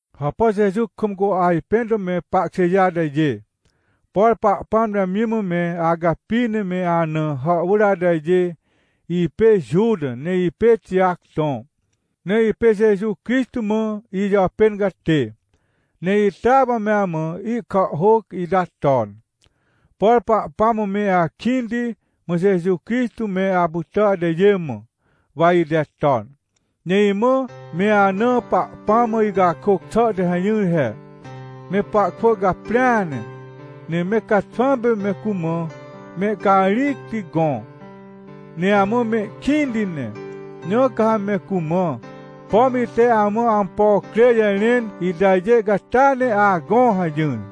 Hàpà Jeju kam cu ajpẽn to me pahkjêjê atajê! Por Pahpãm te amji mã me acapi ne me ana hàhwỳr atajê. Ipê Juta, ne ipê Tijac tõ, ne ipê Jeju Crixtô mã ijàpên catê, ne itea wa me amã ihkàhhôc ita ton. Por Pahpãm mã me akĩnti, mã Jeju Crixtô me apytà atajê mã, wa ite ton. Ne imã me ana Pahpãm mã icakôc xà te hajỹr he: — Me pahkwỳ caprĩa ne, ne me caxwãm pê me cumã mehcarĩcti gõ, ne amã mehkĩnti ne. Na ca ha me cumã, pom ite amã ampo crê jarẽn itajê catia ne agõ — hajỹr.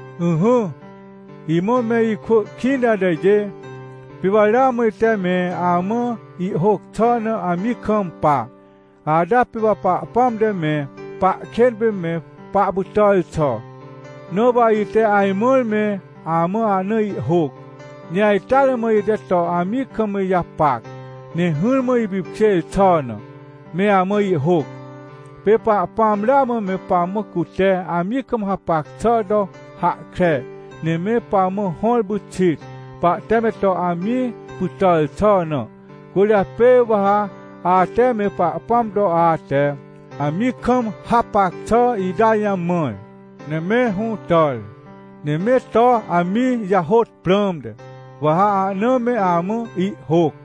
Ỹhỹ, imã me ikwỳ kĩnti atajê. Pê wa ramã ite me amã ihhôc xà na amji kampa, ata pê Pahpãm te me pahkên pê me pahpytàr xà. Na wa ite ajmãr me amã ahna ihhôc. Ne ajteare mã ite to amji kam ijapac, ne hỹrmã ipipkjêr xà na, me amã ihhôc. Pê Pahpãm ramã me pamã cute amji kam hapac xà to hahkre, ne me pamã hõr pyxit, pahte me to amji pytàr xà na. Cwỳrjapê wa ha ate me Pahpãm to ate amji kam hapac xà ita jamãr, ne me hũtàr, ne me to amji jahôt prãmte, wa ha ahna me amã ihhôc.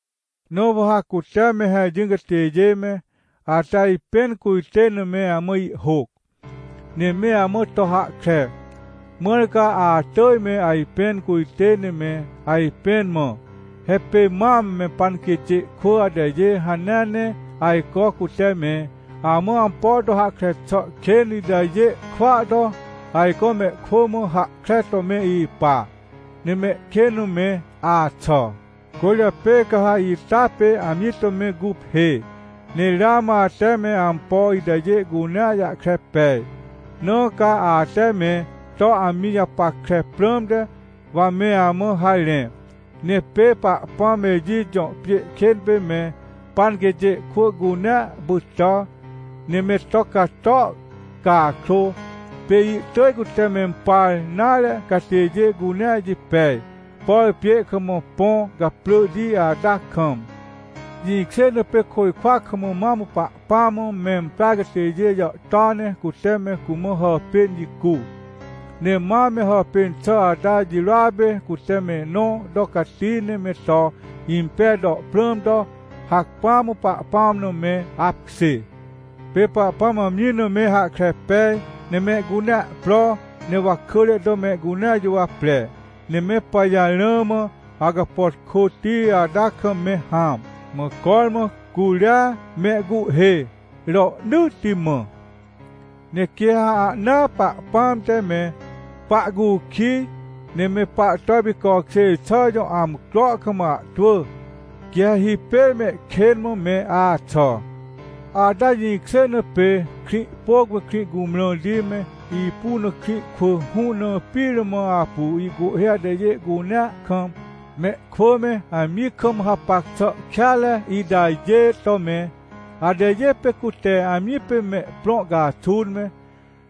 Na wa ha cute me hajỹr catêjê me, ate ajpẽn cujtên na me amã ihhôc, ne me amã to hahkre, mãr ca atỳj me ajpẽn cujtê ne me ajpẽn mã. He pê mam me panquêtjê kwỳ atajê hanea ne ajco cute me amã ampo to hahkre xà kên itajê kwỳa to, ajco mehkwỳ mã hahkre to me ipa, ne mehkên mã me axà. Cwỳrjapê ca ha ita pê amji to me guphê. Ne ramã ate me ampo itajê cunea jahkre pej, na ca ate me to amji japackre prãmte, wa me amã harẽ. Ne pê Pahpãm Ejit jõ pjê kên pê me panquêtjê kwỳ cunea pytà, ne me to cato, cakrô pê ihtỳj cute mempar nare catêjê cunea jipej, por pjê kam põ caprỳhti ata kam. Jĩkjê na pê côjkwa kam mam Pahpãm mã memprar catêjê jàhtôa ne cute me cumã hàpên jicu, ne mam me hàpên xà ata jirôa pê cute mehnõ to cati ne me to impej to prãm to, hacpỹa mã Pahpãm na me apkjê. Pê Pahpãm amji na me hahkre pej, ne mehcunea pro ne wakỳre to mehcunea juwapre, ne me pajarãa mã, awcapàtkôti ata kam me hãm. Mã cormã curia mehcuhhê, rohnỳtti mã. Ne quê ha ahnaa Pahpãm te me pahcukij, ne me pahto ipicokjêr xà jõ amcro kam ahtwỳ, quê ha hipêr mehkên mã me axà. Ata jĩkjê na pê Krĩhpôc me Krĩhcumrãrti me, ipu na krĩ kwỳ hũ na pire mã apu ihcuhhê atajê cunea kam, mehkwỳ me amji kam hapac xà kêanre itajê to me. Atajê pê cute amji pê mehprõ caxun me,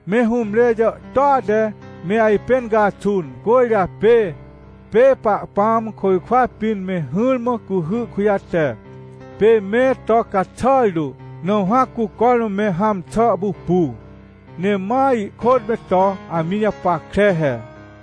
me hũmre jàhtôa te me ajpẽn caxun. Cwỳrjapê pê Pahpãm côjkwa pĩn me hỹrmã cuhy kujate, pê me to caxàr tu. Nãmhã cu cormã me hãm xà pupu, ne ma ihkôt me to amji japackre he.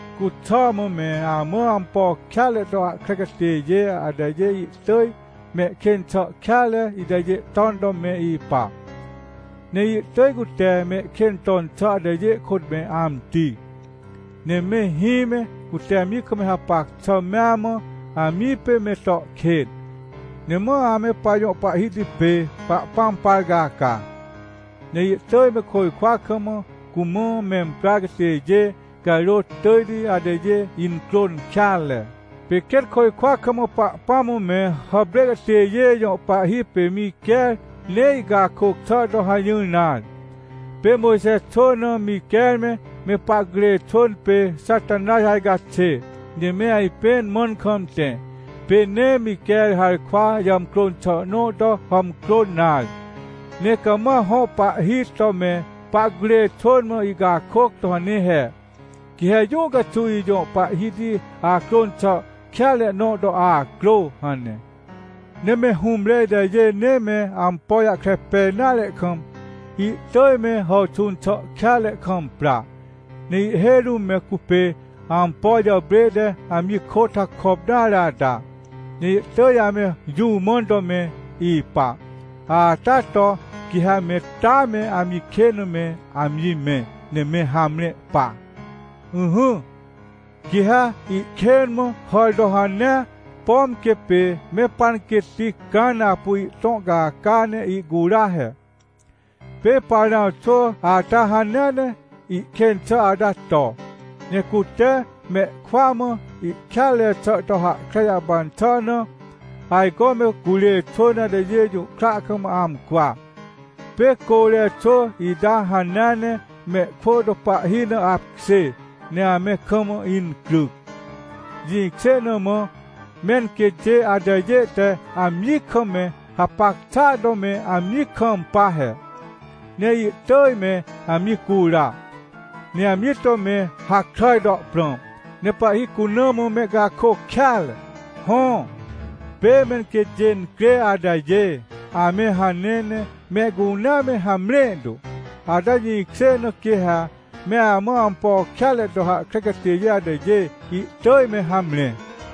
Cuxà mã, me amã ampo kêanre to hahkre catêjê atajê ihtỳj mehkên xà kêanre itajê ton to me ipa. Ne ihtỳj cute mehkên ton xà atajê kôt me amti. Ne me hĩ me, cute amji kam hapac xà mea mã, amji pê me to kên, ne ma ame pajõ Pahhiti pê Pahpãm par caca, ne ihtỳj me côjkwa kam cumã memprar catêjê carôt tỳjti atajê incrôn kêanre. Pê quêt côjkwa kam Pahpãm mã me hàprê catêjê jõ pahhi pê Miquer nee ihcakôc xà to hajỹr nare. Pê Mojxe xwỳ na Miquer me, me pahcurê xwỳn pê Xatanaj ajcaxê, ne me ajpẽn mãn kam tẽ. Pê nee Miquer harkwa jàmcrôn xà nõ to hàmcrôn nare, ne cama hõ Pahhiti to me pahcurê xwỳn mã ihcakôc to hane he: — Quê ha jũ caxuw ijõ Pahhiti acrôn xà kêanre nõ to acrô — hane. Ne me hũmre itajê nee me ampo jahkre pej nare kam, ihtỳj me hàwxũn xà kêanre kam pra. Ne ihhêj rũm me cupê ampo jàprê te amji kôt hakop nare ata, ne ihtỳj ame jũ mãn to me ipa, ata to quê ha me taa me amji kên mã me amji mẽ, ne me hamre pa. Ỹhỹ, quê ha ihkên mã hàr to hanea, pom quê pê me panquêtti Cãn apu ihtõ caca ne ihcura he. Pê Parãw xwỳ ata hanea ne ihkên xà ata to. Ne cute mehkwỳa mã ihkêanre xà to hahkre jahpan xà na, ajco me curê xwỳn atajê jũhkra kam amcwa. Pê Côre xwỳ ita hanea ne mehkwỳ to pahhi na apkjê ne ame kam incryc. Jĩkjê na mã menquêtjê atajê te amji kam me hapac xàa to me amji kampa he, ne ihtỳj me amji cura, ne amji to me hakràj to prãm, ne pahhi cuna mã mehcakôc kêanre. Hõ, pê menquêtjê incrê atajê ame hanea ne mehcunea me hamre tu, ata jĩkjê na quê ha me amã ampo kêanre to hahkre catêjê atajê ihtỳj me hamre.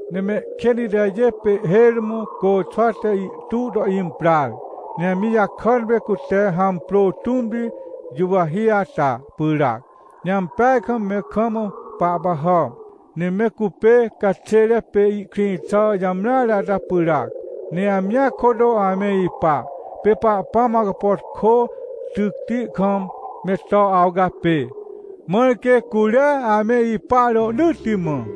Ne mehkên itajê pê ihhêj rũm côxwa te ihtu to imprar, ne amji jakàn pê cute hàmprô tũmti juwahi ata pyràac, ne ampeaj kam me kam pahpahàm. Ne me cupê caxêre pê ihkrĩ xà jamreare ata pyràac, ne amjia kôt ame ipa. Pê Pahpãm awcapàtkô tycti kam me to awcapê, mãr quê curia ame ipa rohnỳtti mã.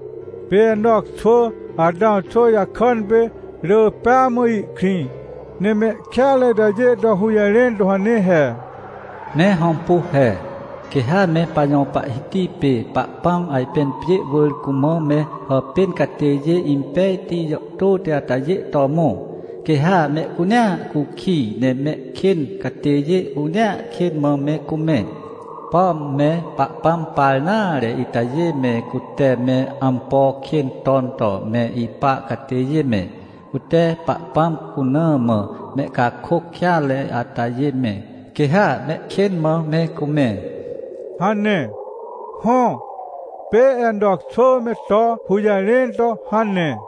Pê Enoc xwỳ, Atãw xwỳ jakàn pê, rỳ pêa mã ihkrĩ, ne mehkêanre itajê to hũjarẽn to hane he: — Me hõmpu he, quê ha me pajõ Pahhiti pê Pahpãm ajpên pjê wỳr cumã me hàpên catêjê impejti jàhtôti atajê to mõ. Quê ha mehcunea cukij, ne mehkên catêjê cunea kên mã me cumẽ. Pom me Pahpãm par nare itajê me, cute me ampo kên ton to me ipa catêjê me, cute Pahpãm cuna mã mehcakôc kêanre atajê me, quê ha mehkên mã me cumẽ — hane. Hõ, pê Enoc xwỳ me to hũjarẽn to hane.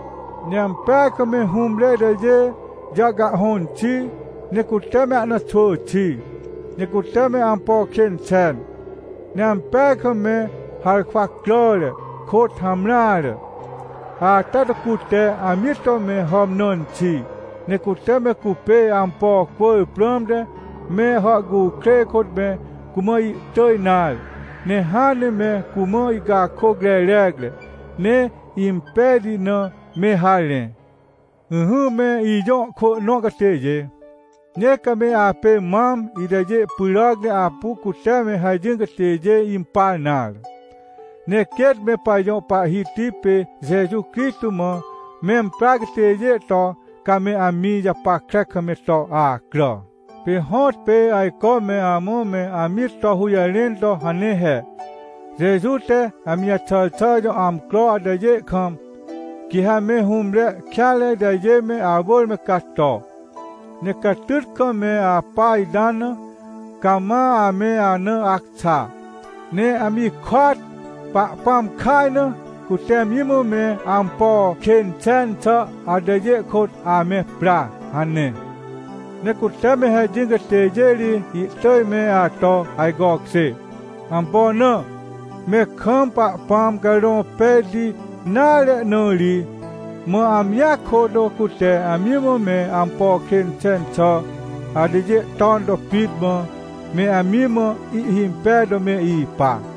Ne ampeaj kam me hũmre itajê jàhcahhõn xi, ne cute me ahna xwỳ xi, ne cute me ampo kên xen. Ne ampeaj kam me harkwa cràre, kôt hamreare, ata to cute amji to me hàmnãn xi. Ne cute me cupê ampo cwỳr prãmte me hàhcukrêj kôt me cumã ihtỳj nare, ne hãn ne me cumã ihcakôc rerecre, ne impejti na, me harẽ. Ỹhỹ, me ijõ ikwỳ nõ catêjê, nee ca me apê mam itajê pyràc ne apu cute me hajỹr catêjê impar nare, ne quêt me pajõ Pahhiti pê Jeju Crixtô mã memprar catêjê to, ca me amji japackre kam me to acrà. Pê hõtpê ajco me amã me amji to hũjarẽn to hane he: — Jeju te amji jaxàr xà jõ amcro atajê kam, quê ha me hũmre kêanre itajê me awỳr me cato, ne catyt kam me apa ita na, cama ame ana acxa. Ne amjia kôt, Pahpãm kaj na, cute amji mã me ampo kên xen xà atajê kôt ame pra — hane. Ne cute me hajỹr catêjê ri ihtỳj me ato ajcokjê. Ampo na? Me kam Pahpãm Carõ Pejti nare na ri. Mã amjia kôt, cute amji mã me ampo kên xen xà atajê ton to pit mã, me amji mã ihhimpej to me ipa.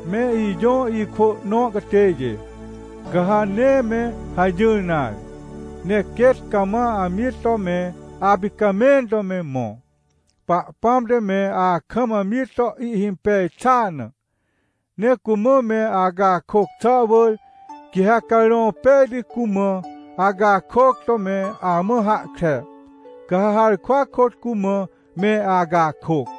Me ijõ ikwỳ nõ catêjê, ca ha nee me hajỹr nare, ne quêt cama amji to me apicamẽn to me mõ, Pahpãm te me akam amji to ihhimpej xàa na. Ne cumã me acakôc xà wỳr, quê ha Carõ Pejti cumã acakôc to me amã hahkre, ca ha harkwa kôt cumã me acakôc.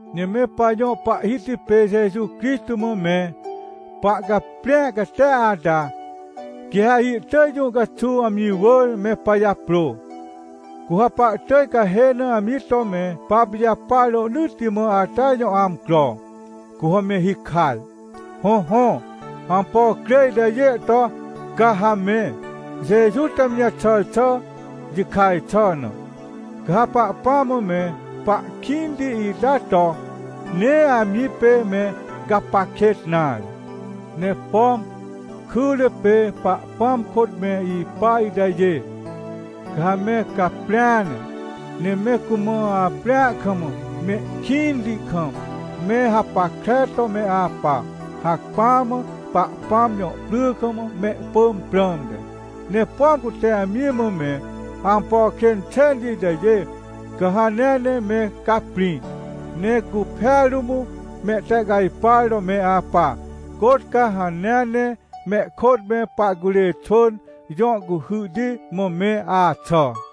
Ne me pajõ Pahhiti pê Jeju Crixtô mã me pahcaprĩ catia ata, quê ha ihtỳj jũ caxuw amji wỳr me pajaprô. Cu ha pahtỳj cahê na amji to me papijapar rohnỳtti mã ata jõ amcro, cu ha me hikaj. Hõhõ, ampo crê itajê to ca ha me, Jeju te amji jaxàr xà jikaj xà na. Ca ha Pahpãm mã me pahkĩnti ita to, nee amji pê me gapac kêt nare. Ne pom kyre pê Pahpãm kôt me ipa itajê, ca ha me caprĩa ne, ne me cumã aprĩa kam, mehkĩnti kam, me hapackre to me apa, hacpỹa mã Pahpãm jõ pry kam mehpỳm prãmte. Ne pom cute amji mã me ampo kên xenti itajê, ca ha hanea ne me caprĩ, ne guphêa rũm mehtehcajpar to me apa, côt ca hanea ne mehkôt me pahcurê xwỳn jõ cuhyhti mã me axà.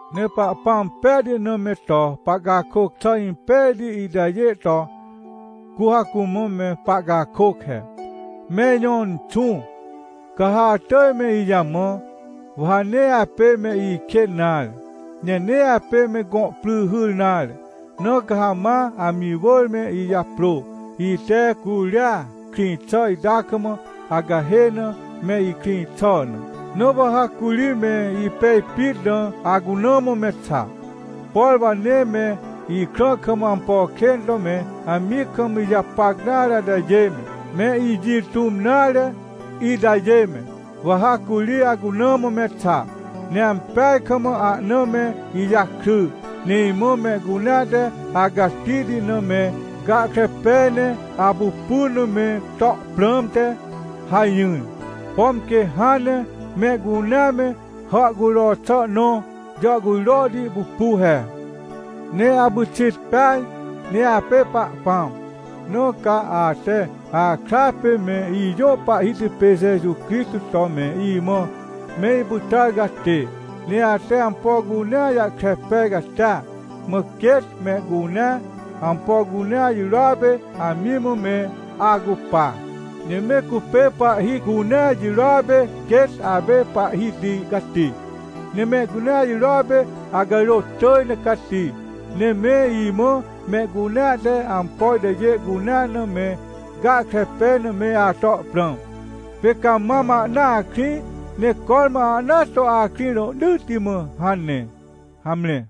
Ne Pahpãm Pejti na me to pahcakôc xà impejti itajê to, cu ha cumã me pahcakôc he: — Me ijõ Inxũ, ca ha atỳj me ijamã, wa ha nee apê me ikên nare, ne nee apê me gõ pry hyr nare. Na ca ha ma amji wỳr me ijaprô, ite curia krĩ xà ita kam acahê na me ikrĩ xà na. Na wa ha curi me ipej pit na acuna mã me xa, por wa nee me ikrã kam ampo kên to me amji kam ijapac nare itajê me, me ijĩ tũm nare itajê me, wa ha curi acuna mã me xa, ne ampeaj kam ahna me ijakry. Ne imã mehcunea te acatihti na me gahkre pej ne apupun na me to prãmte hajỹar, pom quê hãn ne mehcunea me hàhcujro xà nõ jàhcujrohti pupu he. Ne apyxit peaj, ne apê Pahpãm, na ca ate akra pê me ijõ Pahhiti pê Jeju Crixtô to me imã me ipytàr catê. Ne ate ampo cunea jahkre pej catia. Mã quêt mehcunea, ampo cunea jirôa pê amji mã me acupa. Ne me cupê pahhi cunea jirôa pê quêt apê Pahhiti cati, ne mehcunea jirôa pê acarôt tỳj ne cati. Ne me imã mehcunea te ampo itajê cunea na me gahkre pej na me ato prãm. Pê ca mam ahnaa akrĩ, ne cormã ahnaa to akrĩ, rohnỳtti mã — hane. Hamre.